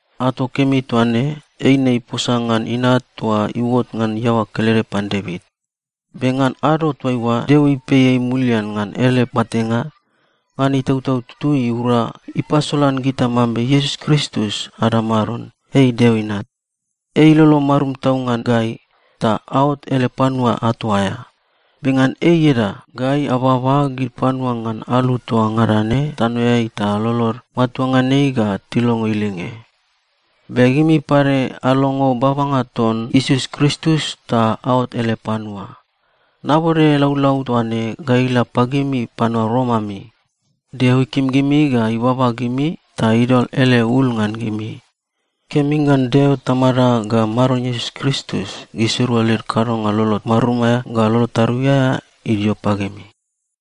Ato kemi toa ne, eine iposa ngan Inat toa iuot ngan iaoa kelede pan Devit. Be ngan ado toaiua Deo ipei ei mulian ngan ele matenga, ngan Itautau Tutui iura, ipasolan gita mambe Iesus Kristus ada Maron, ei Deo Inat. Ei ilolo marum tau ngan gai, ta aot ele panua ato aea. Be ngan ei ieda, gai ababa gid panua ngan alu toa ngada ne tanoeai ta lolod matua ngan ei ga tilongo ilinge. Be gimi pade alongo babanga ton Iesus Kristus ta aot ele panua. Nabode laulau toa ne ga ila pagimi panua Rom ami. Deo ikim gimi ga ibaba gimi ta idol ele ul ngan gimi. Kemi ngan Deo Tamada ga Maron Iesus Kristus, gisirua led kadonga lolo marum aea ga lolo tarui aea idio pagimi.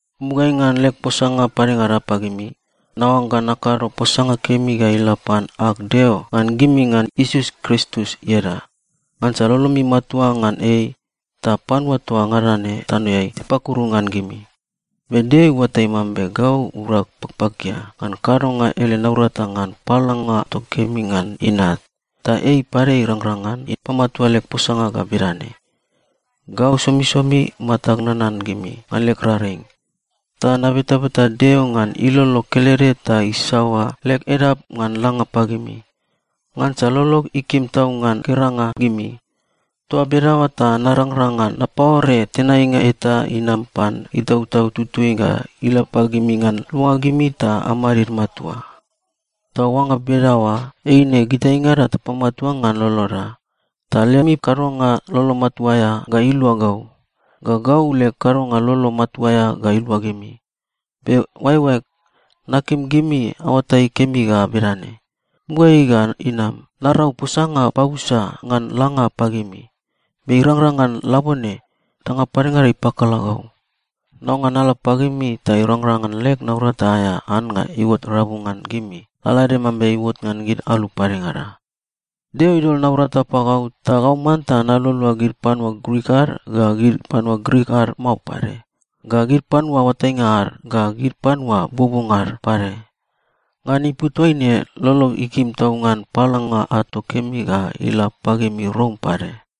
Mugaeai ngan leg posanga padengada pagimi, naoangga nakado posanga kemi ga ila pan ag Deo ngan gimi ngan Iesus Kristus ieda, ngansa lolomi matua ngan ei, ta panua toa ngada ne tanoeai tipakuru ngan gimi. Be Deo iuatai mambe gau urag pakpakia ngan kadonga ele naurata ngan paolanga ato kemi ngan Inat, ta ei pade irangrang ngan ipamatua leg posanga ga bedane: Gau somisomi matag nanan gimi ngan leg raring. Ta nabetabeta Deo ngan ilolo kelede ta isaoa leg edap ngan langa pagimi. Ngansa lolog ikim tau ngan geranga gimi. Toa bedaoa ta narangrang ngan napaore tenainga eta inam pan Itautau Tutui ga ila pagimi ngan luanga gimi ta amadid matua. Ta oangga bedaoa, eine gitaingada tapamatua ngan loloda, ta lemi kadonga lolo matua aea ga ilua gau, ga gau leg kadonga lolo matua aea ga ilua gimi. Be oaeoaeg, nakim gimi aoatai kemi ga bedane: Mugaeai ga inam, narau posanga pabusa ngan langa pagimi, be irangrang ngan labone, danga padengada ipakala gau. Naoangga nala pagimi ta irangrang ngan leg naurata aea annga iuot rabu ngan gimi, lalaede mambe iuot ngan gid alu padengada. Deo idol naurata pagau, ta gau manta nalualua gid panua Grik ad ga gid panua Grik ad mao pade, ga gid panua oatainga ad ga gid panua buobuonga ad pade. Ngan ipu toaine lolog ikim tau ngan paolanga ato kemi ga ila pagimi Rom pade.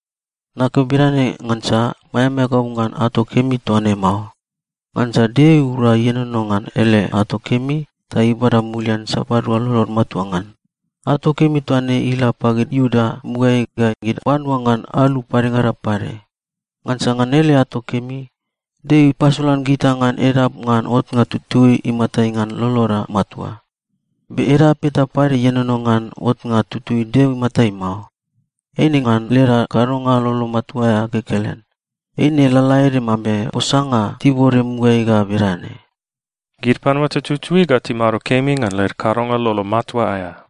Nakeo bedane ngansa maeamaea gau ngan ato kemi toa ne mao. Ngansa Deo iura ienono ngan ele ato kemi ta ibada mulian sapadua lolod matua ngan. Ato kemi toa ne ila pagid Iuda mugaeai ga gid panua ngan alu padengada pade. Ngansa ngan ele ato kemi, Deo ipasolan gita ngan edap ngan otnga tutui imatai ngan loloda matua. Be edap eta pade ienono ngan otnga tutui Deo imatai mao. Eine ngan leda kadonga lolo matua aea kekelen. Eine lalaede mambe posanga tibode mugaeai ga bedane, “Gid panua tututui ga timado kemi ngan led kadonga lolo matua aea.”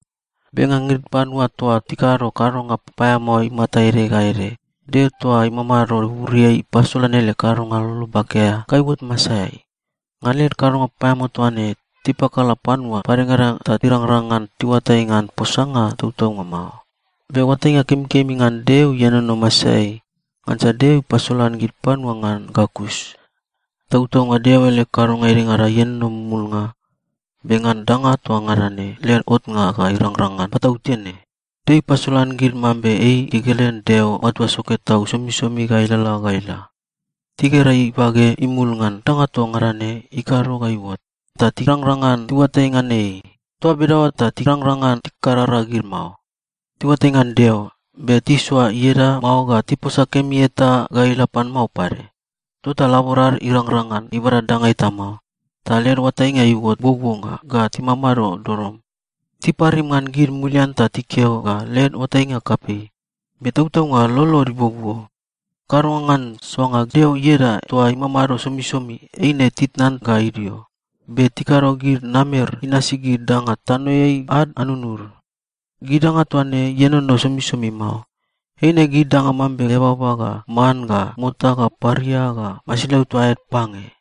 Be ngan gid panua toa tikado kadonga papaeamao imata ede ga ede, Deo toa imamado buburiai ipasolan ele kadonga lolo bake aea ga iuot masaeai. Ngan led kadonga papaeamao toa ne, tipakala panua padengada ta irangrang ngan tiuatai ngan posanga tautaunga mao. Be oatainga kemikemi ngan Deo ienono masaeai, ngansa Deo ipasolan gid panua ngan ga kus. Tautaunga Deo ele kadonga edengada ienono mumulnga, be ngan danga toa ngada ne led otnga ga irangrang ngan patautene, Deo ipasolan gid mambe ei kekelen Deo matua soke tau somisomi ga ilalala ga ila. Tigera ibage imul ngan danga toa ngada ne ikado ga iuot, ta tirangrang ngan tiuatai ngan ei. Toa bedaoa ta tirangrang ngan tikarara gid mao. Tiuatai ngan Deo, be tisoa ieda mao ga tiposa kemi eta ga ila pan mao pade. Tota laborad irangrang ngan ibada danga eta mao, ta led oatainga iuot buobuonga ga timamado dodom. Tiparim ngan gid mulian ta tikeo ga led oatainga kapei, be tautaunga lolod ibuobuo. Kadonga ngan soanga Deo ieda toa imamado somisomi, eine titnan ga idio, be tikado gid namer inasi gid danga tanoeai ad anunud. Gid danga toa ne ienono somisomi mao. Eine gid danga mambe eababa ga man ga mota ga paria ga masilau toa aed pange.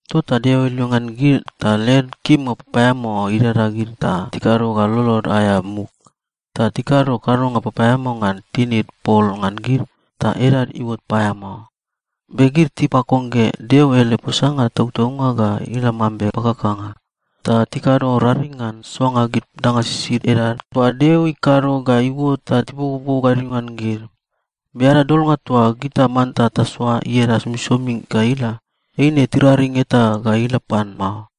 Tota Deo ilongean gid ta led kimnga papaeamao idada gid ta tikado ga lolod aea muk. Ta tikado kadonga papaeamao ngan tinid pol ngan gid, ta edad iuot paeamao. Be gid tipakongge Deo ele posanga tautaunga ga ila mambe pakakanga. Ta tikado raring ngan soanga gid danga sisid edad toa Deo ikado ga iuot ta tibokoboko gadio ngan gid. Be ada Dolnga toa gita manta tasoa ieda somisomi ga ila, eine tiraring eta ga ila pan mao.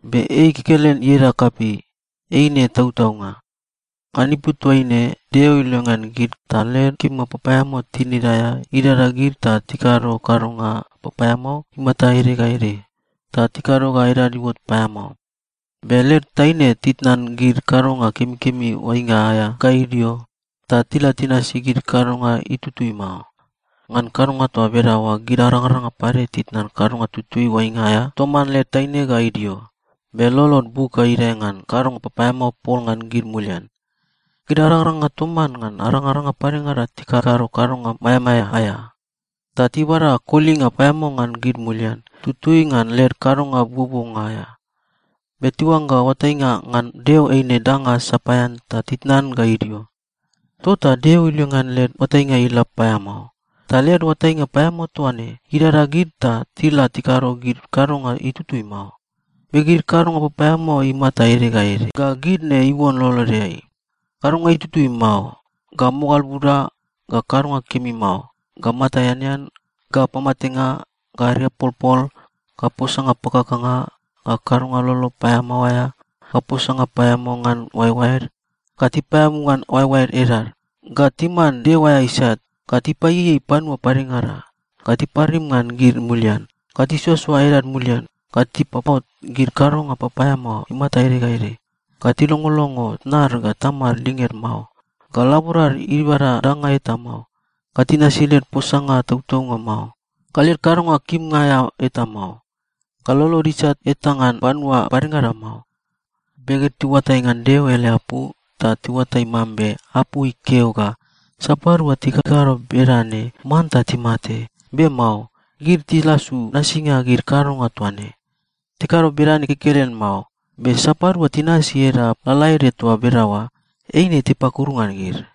Be ei kekelen ieda kapei. Eine tautaunga. Ngan ipu toaine, Deo ilongean gid ta led kimnga papaeamao tinid aea idada gid ta tikado kadonga papaeamao imata ede ga ede, ta tikado ga edad iuot paeamao. Be led taine titnan gid kadonga kemikemi oainga aea ga idio, ta tila tinasi gid kadonga itutui mao. Ngan kadonga toa bedaoa gid arangaranga pade titnan kadonga tutui oainga aea toman led taine ga idio, be lolod buk ga idae ngan kadonga papaeamao pol ngan gid mulian. Gid arangaranga toman ngan arangaranga padengada tikakado kadonga maeamaea aea. Ta tibada kolinga paeamao ngan gid mulian, tutui ngan led kadonga buobuonga aea. Be tiuangga oatainga ngan Deo eine danga sapaean ta titnan ga idio. Tota Deo ilongean led oatainga ila paeamao, ta led oatainga paeamao toa ne idada gid ta tila tikado gid kadonga itutui mao. Be gid kadonga papaeamao imata ede ga ede ga gid ne iuon lolodeai: kadonga itutui mao, ga mogal buda, ga kadonga kemi mao, ga mata eanean, ga pamatenga, ga ariapolpol, ga posanga pakakanga, ga kadonga lolo paeamao aea, ga posanga paeamao ngan oaeoaed, ga tipaeabu ngan oaeoaed edad, ga timan Deo aea isat, ga tipaieiei panua padengada, ga tiparim ngan gid mulian, ga tisoasoa edad mulian, ga tipapot gid kadonga papaeamao imata ede ga ede, ga tilongolongo tnad ga tamad linged mao, ga laborad ibada danga eta mao, ga tinasi led posanga tautaunga mao, ga led kadonga kimnga aea eta mao, ga lolod isat eta ngan panua padengada mao. Be gid tiuatai ngan Deo ele apu, ta tiuatai mambe apu ikeo ga sapadua tikakado bedane manta timate, be mao. Gid tilasu nasinga gid kadonga toa ne. Tikado bedane kekelen mao, be sapadua tinasi edap lalaede toa bedaoa, eine tipakuru ngan gid.